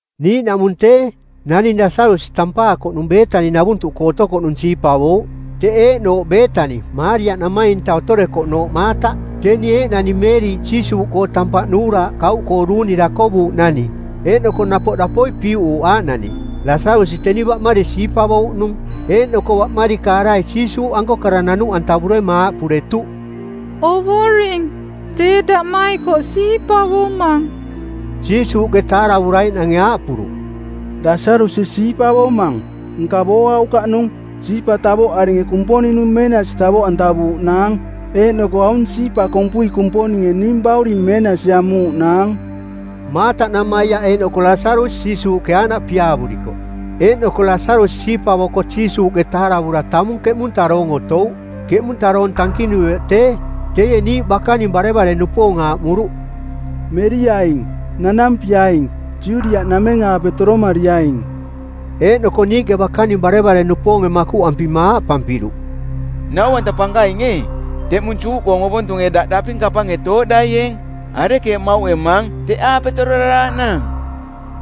Niiꞌnaꞌmung tee, naning Lasarusi tampaakoꞌnung, Beetani-navuntuꞌkoo otokoꞌnung siipavouꞌ. Teꞌ eeꞌnooꞌ Beetani Maaria-namainta otorekoꞌnooꞌ Maataꞌ. Teni eeꞌnani Meeriꞌ Jiisuuꞌkoo tampaꞌ nuuraaꞌ kauꞌkoo duuni dakovuuꞌnani eeꞌnoko napoꞌ dapoi piuꞌuuꞌ aaꞌnani. Lasarusi teni baꞌmari siipavouꞌnung. Eeꞌnoko baꞌmari-kaarai Jiisuuꞌanko kara nanuꞌantavurema aaꞌpuretuꞌ, “Ovoring, tee daꞌmaikoꞌ siipavomang.” Jiisuuꞌke taaravuraiꞌnange aaꞌpuruꞌ, “Lasarusi siipavomang, nka booaukaꞌnung. Siipa tavoꞌaringe Kumponing-nung meenasi tavoꞌantavuuꞌnaang. Eeꞌnoko aung siipa kompui Kumponinge ning Bauring meenasi amuuꞌnaang.” Maataꞌnamaiaꞌ eeꞌnoko Lasarusi Jiisuuꞌke aaꞌnaꞌ piaavurikoꞌ. Eeꞌnoko Lasarusi siipavoko Jiisuuꞌke taaravura tamung keꞌmunta doong otouꞌ. Keꞌmunta doong tankinuioꞌ tee, teie niiꞌ bakaning barevare-nupoong aaꞌmuruꞌ, “Meriaing; nanampiaing; Judiaꞌnameng-aape toromariaing.” Eeꞌnoko niiꞌke bakaning barevare-nupoonge makuꞌampima aaꞌpampiruꞌ, “Nau-anta Pankaing ee, teꞌmung Juꞌkoong ovontunge daꞌ daping kapange tooꞌdaieeng. Arekeeꞌ mauꞌemaang teꞌaape tororaraaꞌnaang?”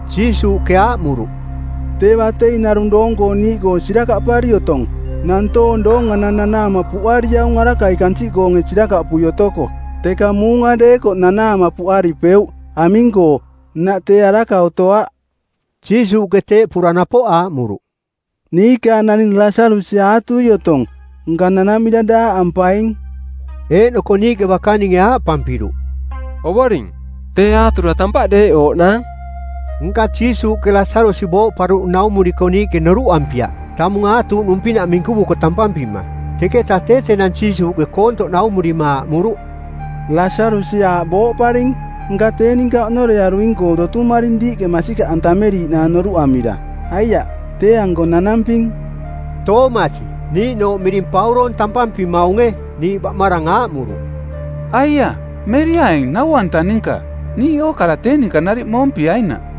Jiisuuꞌke aaꞌmuruꞌ, “Tee batei narung doong-koong niiꞌkoo sirakaꞌpari otong. Nantoong doonganang nanaama puꞌariaung arakai kansiꞌkoonge sirakaꞌpui otoko. Teka muunga deekoꞌ nanaama puꞌaripeuꞌ, aming-koo, nnaꞌ tee araka otoaꞌ.” Jiisuuꞌke teeꞌpura napoꞌ aaꞌmuruꞌ, “Niikaang naning Lasarusi aatui otong, nka nanamira daaꞌampaing.” Eeꞌnoko niiꞌke bakaninge aaꞌpampiruꞌ, “Ovoring, tee aatura tampaꞌ deeꞌooꞌnaang.” Nka Jiisuuꞌke Lasarusi booꞌparuꞌnung naumuriko niiꞌke noruꞌampiaꞌ, tamung aatuuꞌnung pinaꞌ minkuvuko tampampima. Teketa tee tenang Jiisuuꞌke koontoꞌ naumurima aaꞌmuruꞌ, “Lasarusi aaꞌ booꞌparing. Nka tee ninka oꞌnorearuing-koo dotumaring diiꞌke masikaꞌantameriiꞌnaang noruꞌamira. Aiaꞌ, tee-anko nanamping.” Toomasi, niiꞌnooꞌ miring Pauroong tampampimaunge, niiꞌ baꞌmarang aaꞌmuruꞌ, “Aiaꞌ meriaing Nau-anta ninka, niiꞌ ookara tee ninka nariꞌ moompiainaꞌ.”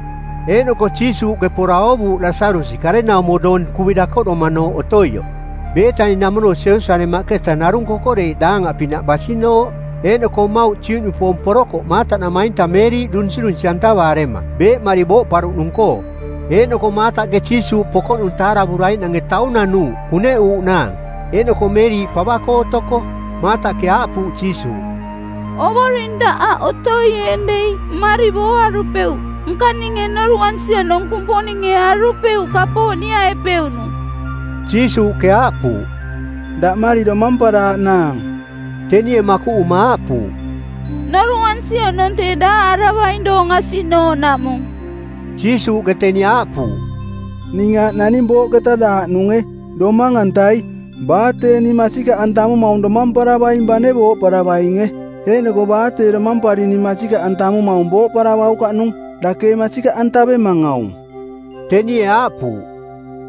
Eeꞌnoko Jiisuuꞌke pora oovuuꞌ Lasarusi karenaumo doong kuvi dakoꞌdomanooꞌ otoioꞌ. Beetani-namono Jerusalemaꞌketa narung kokoreiꞌ daangaꞌpinaꞌ basinooꞌ. Eeꞌnoko mmauꞌ Juꞌnupoong porokoꞌ Maataꞌnamainta Meeriꞌ dunsirunsi-antavaarema˜ beeꞌmari booꞌparuꞌnung-koo. Eeꞌnoko Maataꞌke Jiisuuꞌ pokoꞌnung taaravuraiꞌnange taung nanuuꞌ kuneꞌuuꞌnaang, eeꞌnoko Meeriꞌ pava-koo otoko. Maataꞌke aaꞌpuuꞌ Jiisuuꞌ, “Ovoring, daꞌ aꞌ otoieeng dei mmari booarupeuꞌ. Nka ninge noruꞌansi oꞌnong Kumponinge arupeuꞌ kapooꞌ niaꞌepeuꞌnung.” Jiisuuꞌke aaꞌpuuꞌ, “Daꞌmari domamparaaꞌnaang.” Tenie makuꞌuma aaꞌpuuꞌ, “Noruꞌansi oꞌnong tee daaꞌaravaing doong asiꞌnooꞌnaꞌmung.” Jiisuuꞌke teni aaꞌpuuꞌ, “Ning aaꞌ naning booꞌketa daaꞌnunge, domang-antai. Baa tee ning masikaꞌantamumaung domamparavaing bane booꞌparavainge. Eeꞌnoko baa tee domampari ning masikaꞌantamumaung booꞌparavaukaꞌnung. Dake ee masikaꞌantavemang aung?” Tenie aaꞌpuuꞌ,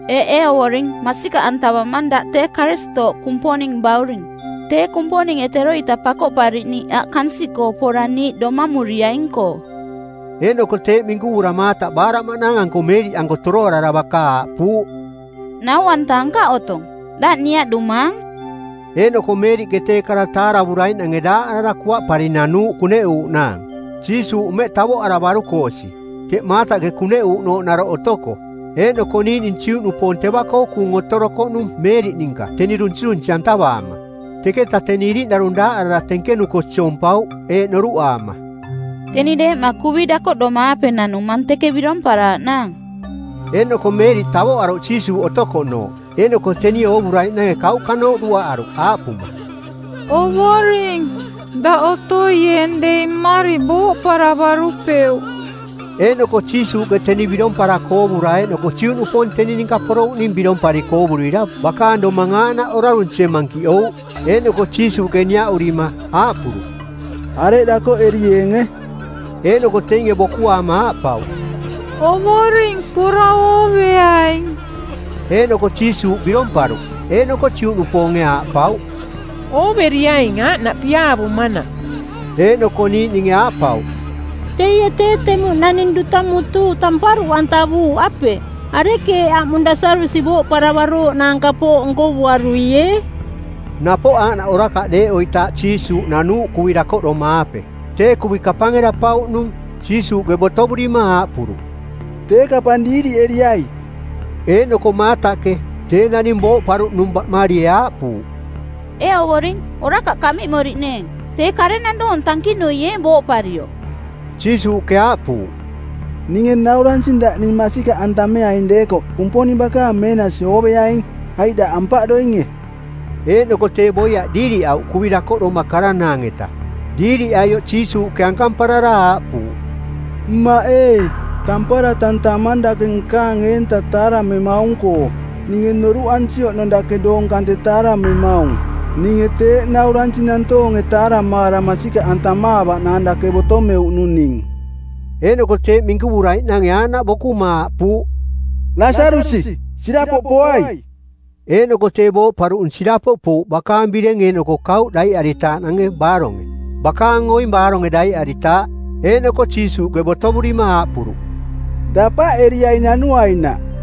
“Eeꞌ, ee Ovoring, masikaꞌantavamang daꞌ tee Karistooꞌ, Kumponing Bauring, tee Kumponinge teroita Pakoꞌpariꞌniiꞌ aꞌ kansiꞌkoo pora niiꞌ domamuriaing-koo.” Eeꞌnoko teeꞌ minkuvura Maataꞌ baaraꞌmaꞌnaang-anko Meeriꞌanko toroarara baka aaꞌpuuꞌ, “Nau-anta ankaꞌ otong, daꞌ niaꞌdumaang.” Eeꞌnoko Meeriꞌke tee kara taaravuraiꞌnange daaꞌarara kuaꞌpari nanuuꞌ kuneꞌuuꞌnaang. Jiisuuꞌ mmeꞌ tavoꞌaravaruko osi, teꞌ Maataꞌke kuneꞌuuꞌnooꞌ naroꞌ otoko. Eeꞌnoko niiꞌning Juꞌnupoong teva-koo kuung otorokoꞌnung Meeriꞌ ninka teni dunsirunsi-antavaama. Teketa teni iriꞌnarung daaꞌarara tenkenuko siompauꞌ, eeꞌ noruꞌaama, “Teni deeꞌma kuvi dakoꞌdoma-aape nanumang teke biromparaaꞌnaang.” Eeꞌnoko Meeriꞌ tavoꞌaruꞌ Jiisuuꞌ otokoꞌnooꞌ. Eeꞌnoko tenie oovuraiꞌnange kauꞌkanooꞌ duaꞌaruꞌ aaꞌpuma, “Ovoring, daꞌ otoieeng dei mmari booꞌparavarupeuꞌ.” Eeꞌnoko Jiisuuꞌke teni biromparako oovura eeꞌnoko Juꞌnupoong teni ninka porouꞌning birompariko oovurira bakaang domang aaꞌnaꞌ orarunsie mankiꞌouꞌ. Eeꞌnoko Jiisuuꞌke niaꞌurima, aaꞌpuruꞌ, “Areꞌ dakoꞌerieenge?” Eeꞌnoko teinge bokuaama aaꞌpauꞌ, “Ovoring, pora ooveaing.” Eeꞌnoko Jiisuuꞌ biromparuꞌ. Eeꞌnoko Juꞌnupoonge aaꞌpauꞌ, “Ooveriaing aaꞌnaꞌ piaavumanaꞌ.” Eeꞌnoko niiꞌninge aaꞌpauꞌ, “Teie tee temuꞌ naning duta mutuu tamparuꞌantavuuꞌ, apeꞌ? Arekeeꞌ aꞌmung Lasarusi booꞌparavarooꞌnaang kapooꞌ nkovuaruiee?” Napoꞌ aaꞌnaꞌ orakaꞌ deeꞌoitaaꞌ Jiisuuꞌ nanuuꞌ kuvi dakoꞌdoma-aape. Tee kuvi kapange daꞌpauꞌnung. Jiisuuꞌke botovurima aaꞌpuruꞌ, “Tee kapang diiriꞌeriai.” Eeꞌnoko Maataꞌke, tee naning booꞌparuꞌnung baꞌmarie aaꞌpuuꞌ, “Ee Ovoring, orakaꞌ kaꞌmiꞌmoriꞌneeng. Tee karenang doong tankinuieeng booꞌparioꞌ.” Jiisuuꞌke aaꞌpuuꞌ, “Ninge nauransing daꞌ ning masikaꞌantameaing deekoꞌ Kumponing bakaang meenasi ooveaing. Aiꞌ daꞌ ampaꞌdoinge?” Eeꞌnoko tee boiaꞌ diiriꞌauꞌ kuvi dakoꞌdoma karanaang-eta. Diiriꞌaioꞌ Jiisuuꞌke ankamparara aaꞌpuuꞌ, “Mmaꞌ ee, tampara tantamang dake nkaang eenta taaramemaung-koo. Ninge noruꞌansi oꞌnong dake doong kante taaramemaung. Ninge teeꞌ nauransing nantoonge taaramaara masikaꞌantamaavaꞌnaang dake botomeuꞌnung ning.” Eeꞌnoko teeꞌ minkuvuraiꞌnange aaꞌnaꞌ bokuma aaꞌpuuꞌ, “Lasarusi, sirapoꞌ poai!” Eeꞌnoko tee booꞌparuꞌnung sirapoꞌ pouꞌ bakaang bireng eeꞌnoko kauꞌ daiꞌaritaaꞌnange baaronge, bakaang oing baaronge daiꞌaritaaꞌ. Eeꞌnoko Jiisuuꞌke botovurima aaꞌpuruꞌ, “Dapaꞌeriaing nanuainaꞌ.”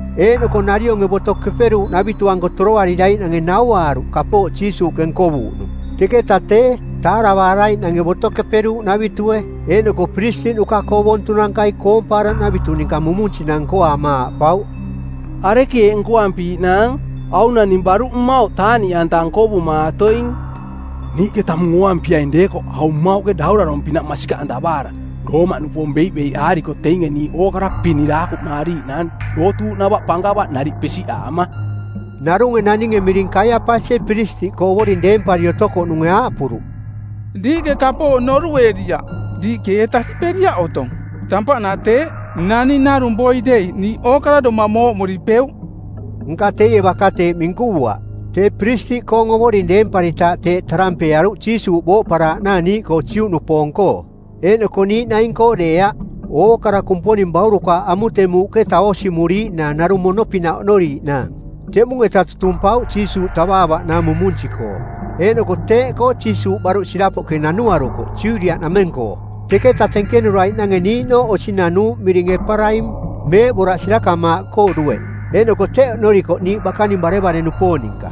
Eeꞌnoko narionge Boto Keperuuꞌnavitu-anko toroariraiꞌnange nauaaruꞌ kapooꞌ Jiisuuꞌke nkovuuꞌnung. Teketa tee, taaravaaraiꞌnange Boto Keperuuꞌnavitue eeꞌnoko piristiꞌnuka-koo ovontunankai koompaaraꞌnavitu ninka mumunsinang nkoaama aaꞌpauꞌ, “Arekeeꞌ nkoampiiꞌnaang? Aung naning baruꞌ mmauꞌ taaꞌniꞌanta nkovumaatoing. Niiꞌke tamung ooampiaing deekoꞌ aung mmauꞌke daurarong˜pinaꞌ masikaꞌantavaara Roomaꞌnupoong beiꞌbeiꞌaariko teinge niiꞌ ookara piniraakuꞌmaariaing dootuuꞌnava pankava nariꞌ pesiꞌaama.” Narunge naninge miring Kaiapasie Piristiꞌkoo Ovoring deempari otokoꞌnunge aaꞌpuruꞌ, “Diiꞌke kapooꞌ noruꞌeriaꞌ. Diiꞌke ee tasiꞌperiaꞌ otong tampaꞌnaꞌ teeꞌ naning narung boi dei niiꞌ ookara domang mooꞌmaripeuꞌ.” Nka teie baka teeꞌ minkuvuaꞌ, tee Piristiꞌkoong Ovoring deemparitaaꞌ teeꞌ tarampeearuꞌ Jiisuuꞌ booꞌparaaꞌnaang niiꞌkoo Juꞌnupoong-koo. Eeꞌnoko niiꞌ naing-koo deeaꞌ, ookara Kumponing baurukaaꞌ amutemuuꞌketa oosimuriiꞌnaang narung mono-pinaꞌ oꞌnoriiꞌnaang. Teꞌmung-eta tutumpauꞌ Jiisuuꞌ tavaavaꞌnaang mumunsi-koo. Eeꞌnoko teeꞌkoo Jiisuuꞌ baruꞌ sirapoꞌke nanuarukoꞌ Judiaꞌnameng-koo. Teketa tenkenuraiꞌnange niiꞌnooꞌ osi nanuuꞌ miring Eparaim, meeꞌboraꞌ sirakamaaꞌkoo dueꞌ. Eeꞌnoko teꞌ oꞌnorikoꞌ niiꞌ bakaning barevare-nupoong ninka.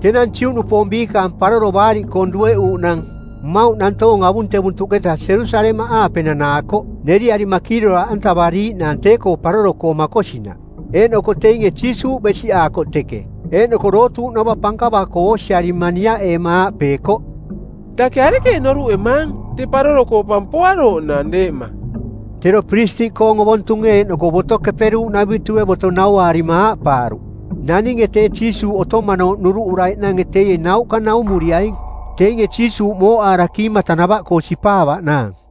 Tenang Juꞌnupoong biikaang Paroro Baariꞌkoong˜ dueꞌuuꞌnang. Mmauꞌ nantoong avuntevuntuꞌketa Jerusalemaꞌaape nanaakoꞌ neriarima kiiroraaꞌantavariaꞌnaang tee-koo paroro-koo makosinaꞌ. Eeꞌnoko teinge Jiisuuꞌ besiꞌaakoꞌ teke, eeꞌnoko dootuuꞌnava pankava-koo oosiarima niaꞌeema aaꞌpeekoꞌ, “Dake arekeeꞌ noruꞌemaang? Tee paroro-koo pa poarooꞌnaang deeꞌma.” Tero piristiꞌkoong ovontunge eeꞌnoko Boto Keperuuꞌnavitue boto nauaarima aaꞌpaaruꞌ, “Naninge tee Jiisuuꞌ otomanooꞌ noruꞌuraiꞌnange teie nauꞌka naumuriaing, teinge Jiisuuꞌ mooꞌaara kiimata-nava-koo sipaavaꞌnaang.”